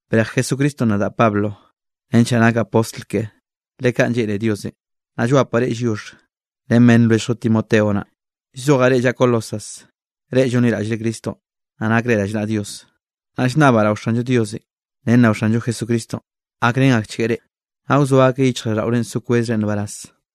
Brej Jesucristonꞌ nadaꞌ Pablo nench naꞌ nakaꞌ postl keꞌe, le kaꞌn lleꞌne Diosenꞌ. Naꞌ llwapaꞌ reꞌ lliox ren beꞌnn lwelljllo Timoteo naꞌ. Llzojaꞌ reꞌ llaꞌa Colosas, reꞌ llonliraꞌll Cristonꞌ, naꞌ nakre rallnaꞌa Dios. Naꞌ llnnabaꞌ rao Xallo Diosenꞌ ren rao Xanllo Jesucristonꞌ, gakrén akchgueꞌ reꞌ, naꞌ wzoa akeꞌ yichjraꞌlldaꞌorenꞌ so kwezre nbaraz.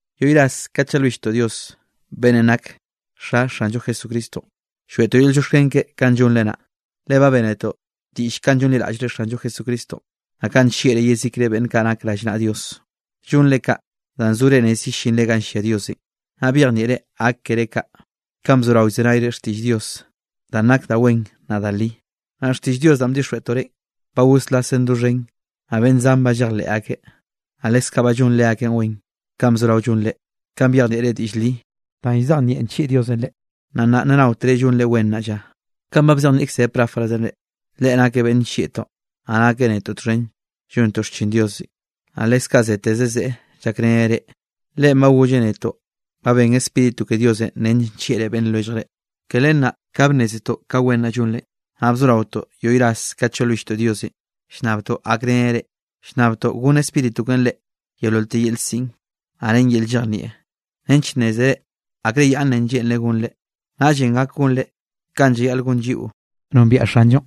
Yoꞌy ras kat llalwilltoꞌ Dios beꞌnnenꞌ nak Xa Xanllo Jesucristonꞌ, lloeꞌtoꞌ yel llioxken keꞌe kanꞌ llonre naꞌ. Le ba bénetoꞌ diꞌll kanꞌ llonliraꞌllre Xanllo Jesucristonꞌ, naꞌ kanꞌ nllieꞌre yezikre beꞌnn kaꞌ nak rallnaꞌa Dios. Llonre kaꞌ, danꞌ zore rez yellinre ganꞌ llia Diosenꞌ. Naꞌ byejnieꞌre gak keré kaꞌ, kanꞌ bzorao llzenayre xtiꞌll Dios danꞌ nak da wen naꞌ da li. Naꞌ xtiꞌll Dios danꞌ ba bdixjweꞌtoꞌ reꞌ, ba goslasen doxhen, naꞌ beꞌnn zan ba llejleꞌ akeꞌ. Naꞌ lekze kaꞌ ba llon leakeꞌn wen, kanꞌ bzorao llon reꞌ, kanꞌ byejnieꞌre diꞌll li danꞌ llzejnieꞌ nllieꞌ Diosenꞌ reꞌ, naꞌ nnaꞌ naotere llonre wen nnaꞌ lla. Kanꞌ ba bzejnieꞌkze Epafrasenꞌ reꞌ, leꞌe nakeꞌ beꞌnn nllieꞌtoꞌ, naꞌ nakeꞌ netoꞌ txhen llontoꞌ xchin Diosenꞌ, naꞌ leskaꞌ zeteze zeꞌe llakreneꞌ reꞌ. Leꞌen ba golleꞌ netoꞌ ba ben Spíritu ke Diosenꞌ nench nllieꞌre beꞌnn lwelljre. Ke len naꞌ ka bnnézetoꞌ ka wen naꞌ llonre, naꞌ bzoraotoꞌ yoꞌy ras kat llalwilltoꞌ Diosenꞌ llnnabtoꞌ gakreneꞌ reꞌ. Llnnabtoꞌ gonn Spíritu keꞌen reꞌ yeololte yel siꞌn, naꞌ ren yel llejnieꞌn nench nnézere akre yaꞌnnenꞌ lleꞌnreꞌ gonre. Naꞌllenꞌ gak gonre kanꞌ llayaꞌl gon lliꞌo nombiaꞌ Xanllonꞌ.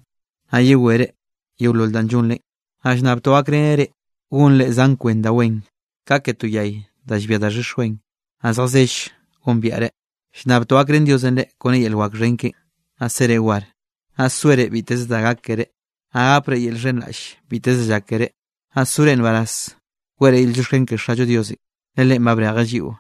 Naꞌ yewereꞌ yeolol danꞌ llonrenꞌ, naꞌ llnnabtoꞌ gakreneꞌ reꞌ gonre zan kwen da wen, ka ke to yay da llbia daxhix wen, naꞌ zjazell gombiaꞌreꞌ. Llnnabtoꞌ gakrén Diosenꞌ reꞌ kone yel wak xhen keꞌen, naꞌ sere war, naꞌ soere biteze da gak keré, naꞌ gapre yel llxhenraꞌll biteze da llak keré. Naꞌ sore nbaraz weꞌre yel llioxken ke Xallo Diosenꞌ, le Leꞌen ba brejeꞌ lliꞌo,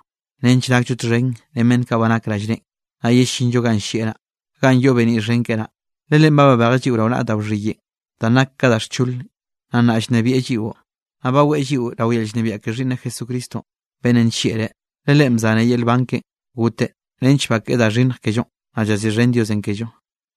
nench nakllo txhen ren beꞌnn kaꞌ nak rallneꞌen, naꞌ yellinllo ganꞌ llieꞌ naꞌ, ganꞌ yoꞌ beniꞌ xhen keꞌe naꞌ. Le Leꞌen babejeꞌ lliꞌo rao naꞌa da wxhiyeꞌn danꞌ nak ka da xcholenꞌ, naꞌ nnaꞌ llnebieꞌ lliꞌo, naꞌ baweꞌ lliꞌo rao yel llnebiaꞌ ke Xhiꞌnneꞌ Jesucristonꞌ beꞌnnenꞌ nllieꞌreꞌ. Le Leꞌen bzaneꞌ yel nban keꞌen goteꞌ, nench bakeꞌe da xhinnj kellonꞌ naꞌ llaziꞌxhen Diosenꞌ kello.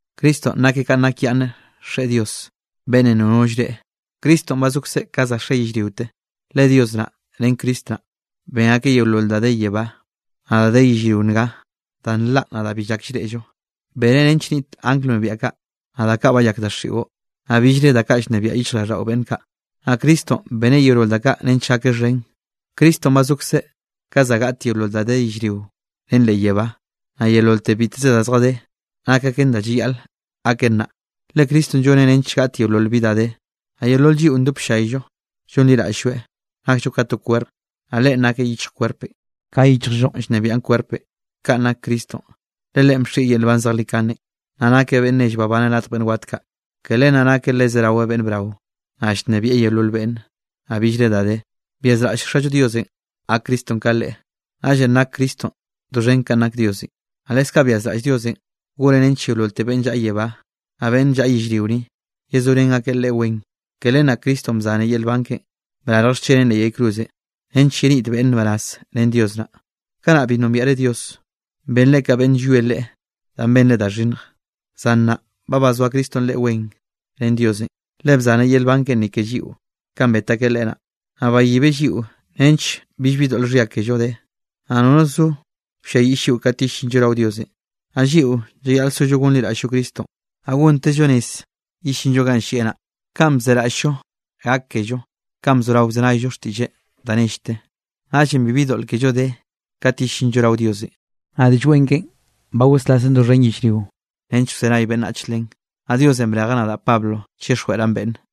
Cristonꞌ nakeꞌ kanꞌ nakyaꞌnne Xeꞌe Dios, beꞌnnenꞌ nono llreꞌe. Cristonꞌ ba zokzeꞌ ka za xe yellriote. Le Dios naꞌ ren Cristo naꞌ, ben akeꞌ yeolol da de yebá, naꞌ da de yellrio nga, da nlaꞌ, naꞌ da bi llak llreꞌllo. Beneꞌ nench niꞌt angl wnebiaꞌ kaꞌ, naꞌ da kaꞌ bayak daxiꞌo, naꞌ billre da kaꞌ llnebiaꞌ yichjraꞌlldaꞌo beꞌnn kaꞌ. Naꞌ Cristonꞌ beneꞌ yeolol da kaꞌ nench gakeꞌ xhen. Cristonꞌ ba zokzeꞌ ka za gaꞌt yeolol da de yellrio ren leꞌ yebá. Naꞌ yeololte biteze da zjadé, nak aken kanꞌ llayaꞌl gaken naꞌ, le Cristonꞌ lloneꞌ nench gaꞌt yeolol bi da de. Naꞌ yeolol lliꞌo ndop llayllo llonliraꞌll-lloeꞌ, nakllo ka to kwerp, naꞌ Leꞌen nakeꞌ yichj kwerpenꞌ, ka yichjllo llnebiaꞌn kwerpenꞌ, kanꞌ nak Cristonꞌ. Le Leꞌen bxieꞌ yel nban zejlikanenꞌ, naꞌ nakeꞌ beꞌnn nell babaneꞌ radj beꞌnn wat kaꞌ. Ke len naꞌ nakeꞌ le zerawe beꞌnn brao, naꞌ llnebieꞌ yeolol beꞌnne, naꞌ billre da de. Byazraꞌll Xallo Diosenꞌ gak Cristonꞌ ka Leꞌe. Naꞌllenꞌ nak Cristonꞌ doxhen kanꞌ nak Diosenꞌ. Naꞌ leskaꞌ byazraꞌll Diosenꞌ goneꞌ nench yeololte beꞌnn llaꞌa yebá, naꞌ beꞌnn llaꞌa yellrio ni, yezorén akeꞌ Leꞌe wen, ke len naꞌ Cristonꞌ bzaneꞌ yel nban keꞌe brarj xcheneꞌn leꞌ yay cruzenꞌ, nench yeniꞌt beꞌnne nbaraz ren Dios naꞌ. Kanaꞌ bi nombiaꞌre Dios. Benre ka beꞌnn llwie Leꞌe danꞌ benre da xhinnj. Zan nnaꞌ ba bazoa Cristonꞌ reꞌ wen ren Diosenꞌ, le bzaneꞌ yel nban keꞌen ni ke lliꞌo, kanꞌ bet akeꞌ Leꞌe naꞌ. Naꞌ bayibeꞌ lliꞌo nench billbi doꞌl xhia kello de, naꞌ nono zo wlliayiꞌll lliꞌo kat yellinllo rao Diosenꞌ. Naꞌ lliꞌo llayaꞌl sollo gonliraꞌll-llo Cristonꞌ, naꞌ gontezllo rez yellinllo ganꞌ llieꞌ naꞌ, kanꞌ bzeraꞌll-llo gak kello kanꞌ bzorao bzenayllo xtiꞌlleꞌn da nellte, naꞌllenꞌ bibi doꞌl kello de kat yellinllo rao Diosenꞌ. Naꞌ Diꞌll Wen keꞌen ba goslasen doxhen yellrio nench wzenay beꞌnnach len, naꞌ Diosenꞌ brejeꞌ nadaꞌ Pablo chixjweꞌraꞌn beꞌnne.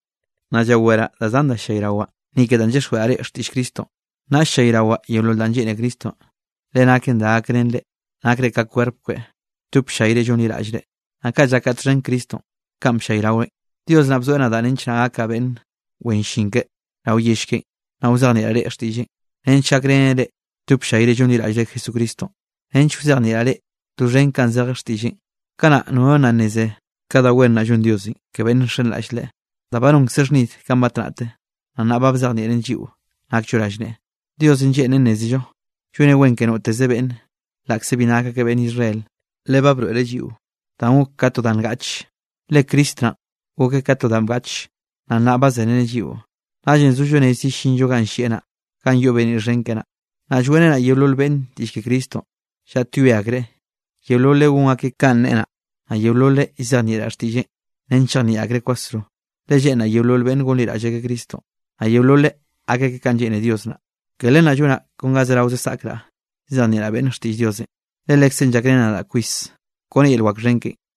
Nnaꞌ llaweraꞌ da zan da ll-llayrawaꞌ ni ke danꞌ llyixjweꞌraꞌ reꞌ xtiꞌll Cristonꞌ, naꞌ ll-llayrawaꞌ yeolol danꞌ lleꞌne Cristonꞌ, le naken da gakrén reꞌ, nakre ka kwerp keꞌe lldop ll-llayre llonliraꞌllreꞌ. Naꞌ kaꞌ llakaꞌ txhen Cristonꞌ kanꞌ bllayraweꞌn. Dios naꞌ bzoeꞌ nadaꞌ nench naꞌ gakaꞌ beꞌnn wen llin keꞌe rao yell keꞌen. Naꞌ wzejnieꞌraꞌ reꞌ xtiꞌlleꞌn, nench gakrenen reꞌ lldop ll-llayre llonliraꞌllre Jesucristonꞌ, nench wzejnieꞌraꞌ reꞌ doxhen kanꞌ zeje xtiꞌlleꞌn. Kanaꞌ nono nna nneze ka da wen naꞌ llon Diosenꞌ ke beꞌnn nxenraꞌll Leꞌe, danꞌ ba nonkzeꞌ xhnid kanꞌ batnaꞌte, naꞌ nnaꞌ ba bzejnieꞌreꞌn lliꞌo nakllo rallneꞌe. Diosenꞌ lleꞌnreꞌ nnézello lloneꞌ wen ke noteze beꞌnn, laꞌkze bi nak akeꞌ beꞌnn Israel. Le ba broeꞌreꞌ lliꞌo danꞌ gok ka to danꞌ ngaꞌchenꞌ, le Cristo naꞌ gokeꞌ ka danꞌ bgaꞌche, naꞌ nnaꞌ ba zereneꞌ lliꞌo, naꞌllenꞌ zollo rez yellinllo ganꞌ llieꞌ naꞌ, ganꞌ yoꞌ beniꞌ xhen keꞌe naꞌ. Naꞌ lloeꞌrenaꞌ yeolol beꞌnn diꞌll ke Cristonꞌ, llaꞌtyoe akreꞌ yeololeꞌ gon akeꞌ kanꞌ neꞌe naꞌ, naꞌ yeololeꞌ llzejnieꞌraꞌ xtiꞌlleꞌn nench chejnieꞌ akreꞌ kwasro, le lleꞌnraꞌ yeolol beꞌnn gonliraꞌll akeꞌ Cristonꞌ, naꞌ yeololeꞌ gak akeꞌ kanꞌ lleꞌne Dios naꞌ. Ke len naꞌ llonaꞌ kon ga zerao saꞌkraꞌ llzejnieꞌraꞌ beꞌnne xtiꞌll Diosenꞌ, le Lekzeꞌn llakreneꞌ nadaꞌ kwis kone yel wak xhen keꞌen.